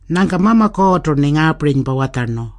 Nyangka Mama Kuurrtu-rni ngaapirinypa watjarnu,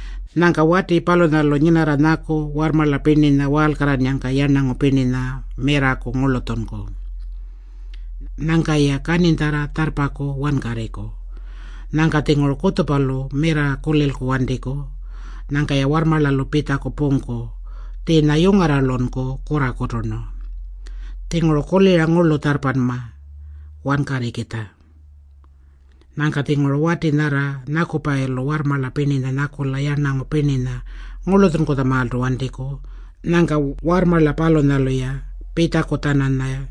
Nyangka wati palunyalu nyinaku nyaku warrmarla pirninya waalkarrannyangka mirraku yarnangu pirninya ngurlutjunku. Nyangka-ya kaninytjarra tjarrpaku wankarriku. Nyangka-tjinguru kutjupalu mirra kulilku wantiku. Nyangka-ya warrmarlalu pitjaku pungku. Tjiinya yungarralunku kurrakuturnu. Tjinguru kulira ngurlu tjarrpama wankarrikitja. Nyangka-tjinguru wati nyarra nyakupayilu warrmarla pirninya nyakula yarnangu pirninya ngurlutjunkutjamaaltu wantiku. Nyangka warrmarla palunyalu-ya pitjaku-tjananya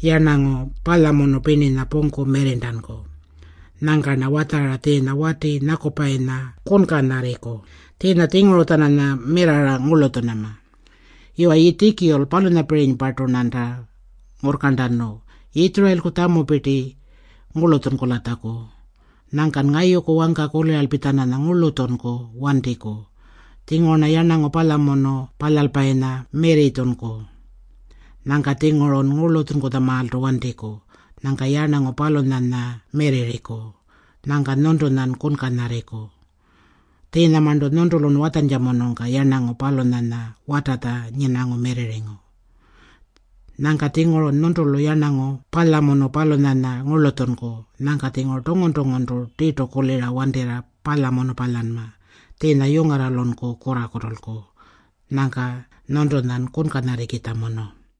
yarnangu palyamunu pirninya pungku mirrirntanku. Nyangka-rna watjara tjiinya wati nyakupayinya kunkanyarriku. Tjiinya tjinguru-tjananya mirrarra ngurlutjunama. Yuwa Yiitjikul, palunyapirinypartu-rnanta ngurrkarntanu Yitjurayilku tjamupirti ngurlutjunkulatjaku. Nyangkan ngayuku wangka kuliralpi-tjananya ngurlutjunku wantiku. Tjinguru-rna yarnangu palyamunu palyalpayinya mirritjunku. Nyangka-tjingurun ngurlutjunkutjamaaltu wantiku. Nyangka yarnangu palunyanya mirrirriku. Nyangka nyuntunyan kunkanyarriku. Tjiinyamarntu nyuntulun watjantjamunungka yarnangu palunyanya watatja nyinangu mirrirringu. Nyangka-tjingurun nyuntulu yarnangu palyamunu palunyanya ngurlutjunku. Nyangka-tjinguru tungun-tunguntu tirtu kulira wantirra palyamunu palyanma. Tjiinya yungarralunku kurrakutulku. Nyangka nyuntunyan kunkanyarrikitjamunu.”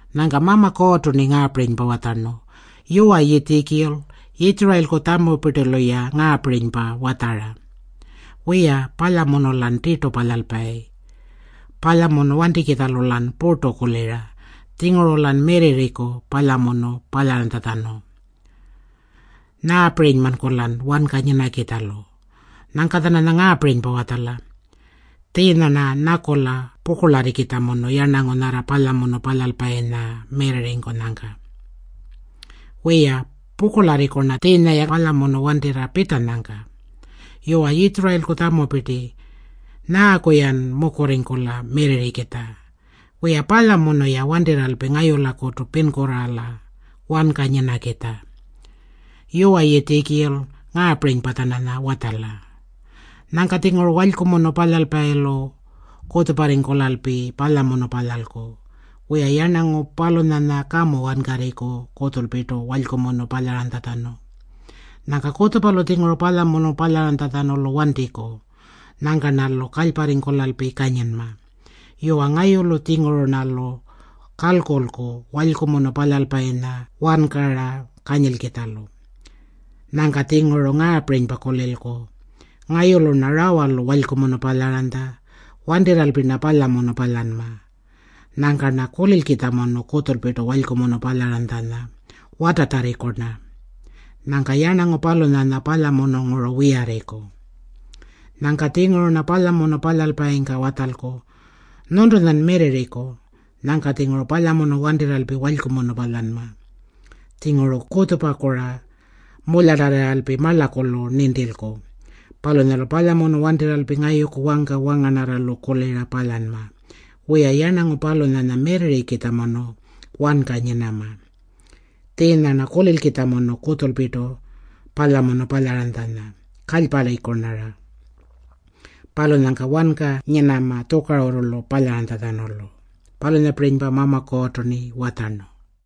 Nyangka Mama Kuurrtu-rni ngaapirinypa watjarnu, “Yuwa Yiitjikul, Yitjurayilku tjamupirtilu-ya ngaapirinypa watjara, ‘Wiya, palyamunu-lan tirtu palyalpayi. Palyamunu wantikitjalu-lan purtu kulira. Tjinguru-lan mirrirriku palyamunu palyaranytjatjanu. Nyaapirinymanku-lan wanka nyinakitjalu?’ Nyangka-tjananya ngaapirinypa watjala. Tjiinya-rna nyakula pukurlarrikitjamunu yarnangu nyarra palyamunu palyalpayinya mirrirringkunyangka. Wiya, pukurlarriku-rna tjiinya-ya palyamunu wantirra pitjanyangka. Yuwa Yitjurayilku tjamupirti, nyaaku-yan mukurringkula mirrirrikitja? Wiya, palyamunu-ya wantirralpi ngayulakutu pinkurraala wanka nyinakitja. Yuwa Yiitjikul, ngaapirinypa-tjananya watjala, Nyangka-tjinguru walykumunu palyalpayilu kutjuparringkulalpi palyamunu palyalku. Wiya, yarnangu palunyanya kamu wankarriku kutjulpirtu walykumunu palyaranytjatjanu. Nyangka kutjupalu-tjinguru palyamunu palyaranytjatjanulu wantiku. Nyangka-rnalu kalyparringkulalpi kanyinma. Yuwa, ngayulu-tjinguru-rnalu kalkulku walykumunu palyalpayinya wankara kanyilkitjalu. Nyangka-tjinguru ngaapirinypa kulilku, ‘Ngayulu-rna rawalu walykumunu palyaranytja. Wantirralpi-rna palyamunu palyanma.’ Nyangka-rna kulilkitjamunu kutjulpirtu walykumunu palyaranytjanya, watatjarriku-rna. Nyangka yarnangu palunyanya palyamununguru wiyarriku. Nyangka-tjinguru-rna palyamunu palyalpayingka watjalku, ‘Nyuntunyan mirrirriku.’ Nyangka-tjinguru palyamunu wantirralpi walykumunu palyanma. Tjinguru kutjupaku-ra mulyatarrirralpi marlakulu nintilku. Palunyalu palyamunu wantirralpi ngayuku wangka wangarnarralu kulira palyanma. Wiya, yarnangu palunyanya mirrirrikitjamunu wanka nyinama. Tjiinya-rna kulilkitjamunu kutjulpirtu palyamunu palyaranytjanya, kalyparriku-rnara. Palunyangka wanka nyinama tjukarurrulu palyantjatjanulu.” Palunyapirinypa Mama Kuurrtu-rni watjarnu.